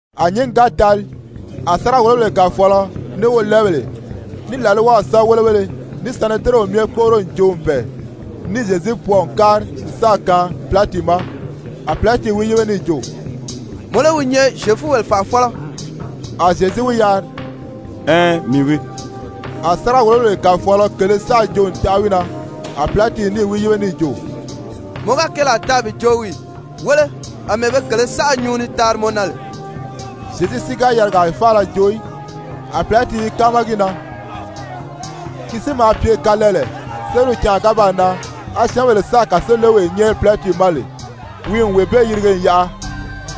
A nyǐngi ga tali, a sáriga-wòlobèle kàfɔɔlɔ, ní wolɛɛbèle, ní làlwaw sɛ́bɛwelebéleSanedirɛnw myɛ kpóʔoro n joo n bɛ̀ɛ, níì Zyezu pwɔɔ n kári n sáà kaan Pilati ma. A Pilati wi yíbe níì jo: «Mɔ lé wi nyɛ Zyefubèle fànʔafɔlɔ?» A Zyezu wi yari: «Ɛɛn, mii wii.» A sáriga-wòlobèle kàfɔɔlɔ kèlē saʔa joo n taʔa wi na. A Pilati níì wi yíbe níì jo: «Mɔ ga keelaa taa bi joo wii ì? Wéle, àmɛɛ be kèlē saʔa nyuu ni taari mɔ na lè.» Zyezu si ga yarigaa faala joo í. A Pilati i káama gi na. Ki si maa pye kalɛɛlɛ, sériw canʔa ga baa nan, á syɛ́ɛnbèle sáà kàsolewee nyɛ́ɛri Pilati ma lè, wi n wee bee yirige n yaʔa.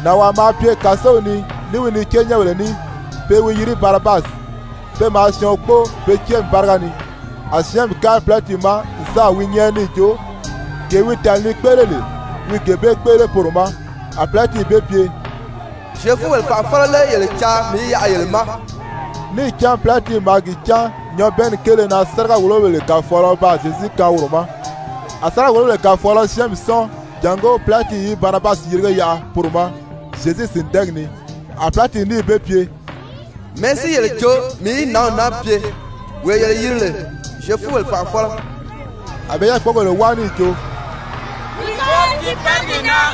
Nànwaa maa pye kàsow ni ní wi niceenyɛnbèle ní, pe i wi yiri Barabasi. Pe maa syɔɔn kpóo be céemi báriga ni. A syɛ́ɛnmi kári Pilati ma n sáà wi nyɛ́ɛri níì jo, gee wi tàli ni kpéʔele lè, wi gee bee kpéʔele poro ma. A Pilati be pye: «Zyefubèle fànʔafɔlɔ lé yele caa mii í yaʔa yele ma?» Níì cán Pilati maa gi cán nyabɛɛnni kéele na sáriga-wòlobèle kàfɔɔlɔ baa Zyezu kaan woro ma. A sáriga-wòlobèle kàfɔɔlɔ syɛ́ɛnmi sɔ́ɔn jàngó Pilati í Barabasi yirige yaʔa poro ma Zyezu sìndɛɛgi ni. A Pilati níì be pye: «Mɛ̀ɛ́ si yele jo mii í nǎnw naa pye, wee yele yiri lè Zyefubèle fànʔafɔlɔ?» A be yákpogèle wáa níì jo: «Wi kóri tiiparigi na.»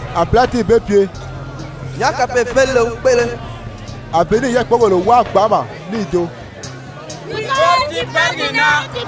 A Pilati be pye: «Nyàʔá kapee-félile wi kpéʔele?» A be níì yákpogèle wáa gbanʔama níì jo: «Wi kóri tiiparigi na.»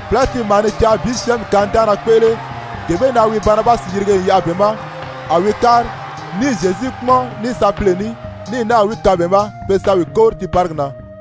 Pilati maa ni caa bi syɛ́ɛnmi kanidaanna kpéʔele, gee bee na wi Barabasi yirige n yaʔa be ma a wi kári, níì Zyezu kpúmɔn ní sapile ní, ní náà wi kaan be ma pe sa wi kóri tiiparigi na.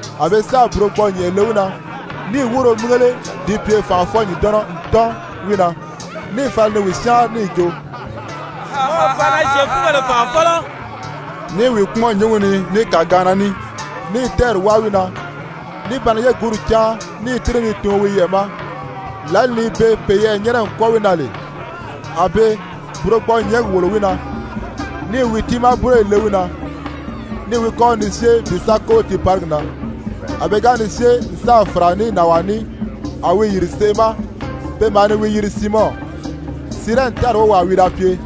A be sáà burogbɔɔ-nyɛ̀nʔɛ le wi na, níì wúuro mígele di pye fànʔafɔ-ǹdɔnnɔ n tɔ́n wi na, níì fala ni wi syáanri níì jo: «Mɔ o faana, Zyefubèle fànʔafɔlɔ.» Ní i wi kpúmɔn nyǔngi ni ní kàgaanna ní, ní i tɛ́ɛri wáa wi na, ní ba ni yégunri cáan ní i tíri ni tuun wi yɛʔɛ̀ ma. Lǎli ni be peyɛɛ nyɛ́nɛ n kwɔ́ɔ wi na lè, a be burogbɔɔ-nyɛ̀ɛ́ngi wòlo wi na, níì wi tiimaa búroyi le wi na, níì wi kɔ́ri ni syée bi sa kóri tiiparigi na. A pe ga ni syée n sáà fàra ní nànwaa ní, a wi yìri seʔe ma, pe maa ni wi yiri Siimɔn, Sirɛni tári wówaa wi da pye.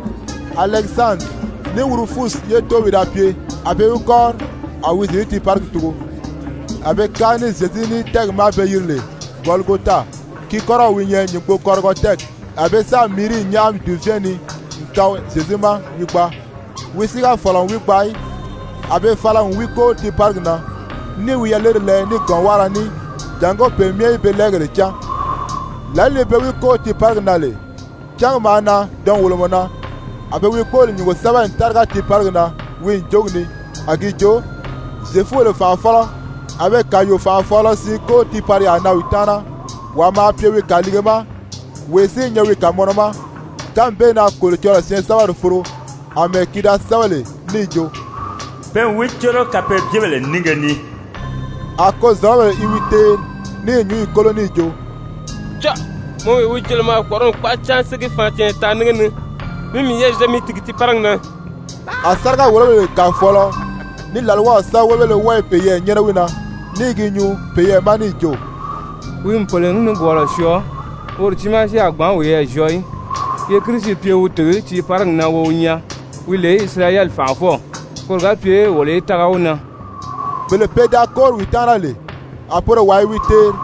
Alɛkisandiri ní Wurufusi ye tóow wi da pye, a be wi kɔ́ri, a wi Zyezu tiiparigi tugo. A be kári ní Zyezu ní tɛ́ɛgi ma be yiri lè Gɔligota, ki kɔ́rɔw wi nyɛ Nyùngbokɔrigɔ tɛ́ɛgi. A be sáà míiri nyáʔami dùvɛɛn ni n kaan Zyezu ma wi gbaa. Wi si ga fɔ̀lɔ n wi gbaa í. A be fala n wi kóri tiiparigi na, níì wi yaleri lɛɛ ní gɔ̌nwáara ní jàngó pe myɛ í be lɛɛgéle cán. Lǎli ni pe wi kóri tiiparigi na lè, cángi maa nan dɔnwolomɔ na. A be wi kpóoli nyúngo sɛ́bɛ n táriga tiiparigi na wi ǹjogi ni a gi jo: ZYEFUBELE FANʔAFƆLƆ. A be kàyuu-fànʔafɔɔlɔ siin kóri tiipariyaa na wi taana, wàa maa pye wi kàliige ma wee si i nyɛ wi kàmɔnɔ ma. [Kánmi bee na Kolocɔlɔɔ syɛɛnsɛbɛri foro, àmɛɛ ki da sɛ́bɛ lè níì jo: «Pe n wi córo kapeebyebèle nínge ni.»] A kozɔ̀lɔbèle i wi teeri ní i nyǔnyi kólo níì jo: «Cɔ́ɔ! Mɔ wee wi jo lè mɔ a kpɔ̀ʔɔrɔli kpaʔa cáan si ní gi faan canya taanri nínge ni, mi miyɛɛ zyɔɔ mi tìgi tiiparigi na.» A sáriga-wòlobèle kàfɔɔlɔ ní làlwaw sɛ́bɛwelebéle wɔ́ɔ i peyɛɛ nyɛ́nɛ wi na, ní i gi nyuu peyɛɛ ma níì jo: «Wi n pèle nikwɔɔlɔ syɔɔ, woro tiimaa si a gbǎn wiyɛɛ zyɔɔ í. Ye Kirisi pye wi tìgi tiiparigi na wo wi nyaa, wi lè Isirayɛli fànʔafɔw, koro ga pye wolo í tága wi na.» Bele pe da kóri wi taana lè, a poro wɔ́ɔ i wi teeri.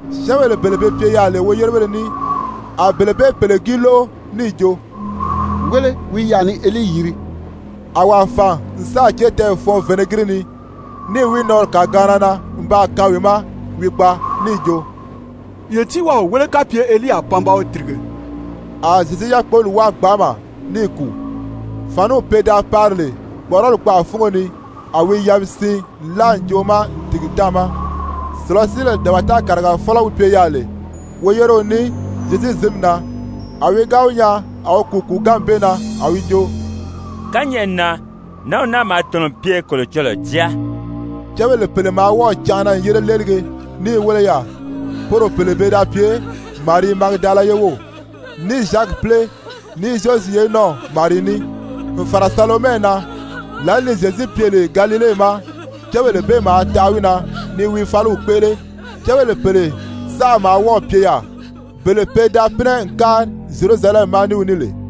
Syɛ́ɛnbèle bele be pye yaà lè woyérebéle ní, a bele bee pèle gi lóʔo níì jo: «Wéle, wi i yaà ni Elii yiri.» A wàa fàn n sáà cétɛɛ fɔɔn vinɛgiri ni, níì wi nɔɔri kàgaanna na n baa kaan wi ma wi gbaa, níì jo: «Ye tíi waa wi wéle kapye Elii a pan ba wi tìrige.» A Zyezu yákpoli wáa gbanʔama níì kùu. Fàniw pe da pari lè kpɔ̀ʔɔrɔli kpaʔa fúngo ni, a wi yabi siin nlaa ǹjoʔo ma n tìgi táàma. Sùlasiibèle dabata kàrigafɔlɔ wi pye yaà lè woyéreo ní Zyezu zǐnmi na, a wi ga wi nyaa a wi kùu kùuganmi bee na, a wi jo: «Kányɛʔɛ na, nǎnw naa maa tɔ̀nɔ n pye Kolocɔlɔɔ Jáa.» Cébèle pèle maa wɔ́ɔ̀ canʔana n yére léelige ní i wéle yaà. Poro pèle pe da pye Marii, Magidala ye wów, ní Zyakipile ní Zyozi ye nɔ́ɔw Marii ní, n fàra Salomɛ na. Lǎli ni Zyezu pye lè Galile ma, cébèle bee maa taʔa wi na ni wi fáliw kpéʔele. Cébèle pèle saʔa maa wɔ́ɔ̀ pye yaà, bele pe da pínɛ n kári Zyerusalɛmi ma ní wi ní lè.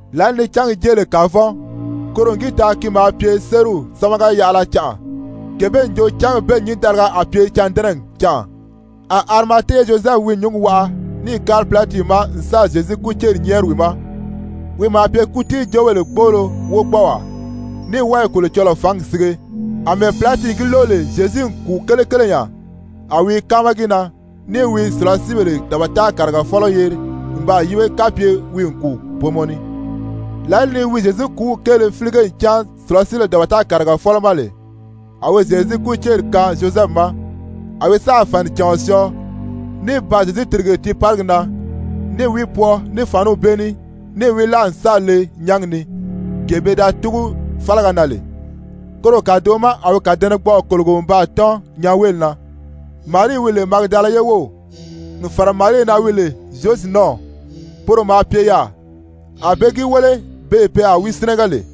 Lǎli ni cángi jée lè kavɔn, koro n gi taa ki maa pye sériw sámaga-yaʔala canʔa gee bee n jo cángi bee nyǐndaliga a pye cândɛnɛgi canʔa. A Arimate ye Zyozɛfu wi nyúngi waʔa níì kári Pilati ma n sáà Zyezu kúceri nyɛ́ɛri wi ma. Wi maa pye kútiijoobèle gboolo wogbɔɔwaa, ní wɔ́ɔ i Kolocɔlɔɔ fǎngi sige. Amɛɛ Pilati gi lóʔo lè Zyezu n kùu kelekele nya, a wi i káama gi na, níì wi sùlasiibèle dabata kàrigafɔlɔ yeri n baa yíbe kapye wi n kùu booma ni. Lǎli ni wi Zyezu kùúw kéele fílige n cán sùlasiibèle dabata kàrigafɔlɔ ma lè, a wi Zyezu kúceri kaan Zyozɛfu ma. A wi sáà fànicàɔn syɔɔ, ní baa Zyezu tìrige tiiparigi na, níì wi pwɔɔ ní fàniw bee ní, níì wi láa n sáà le nyángi ni, gee pe da túgu fálaga na lè, koro kàdoʔo ma a wi kàdɛnɛgbɔʔɔ kòlogo n baa tɔ́n nyanweeli na. Marii wi lè Magidala ye wów, n fàra Marii na wi lè Zyozi nɔ́ɔw, poro maa pye yaà, a be gi wéle beè pe a wi sínɛgɛ lè.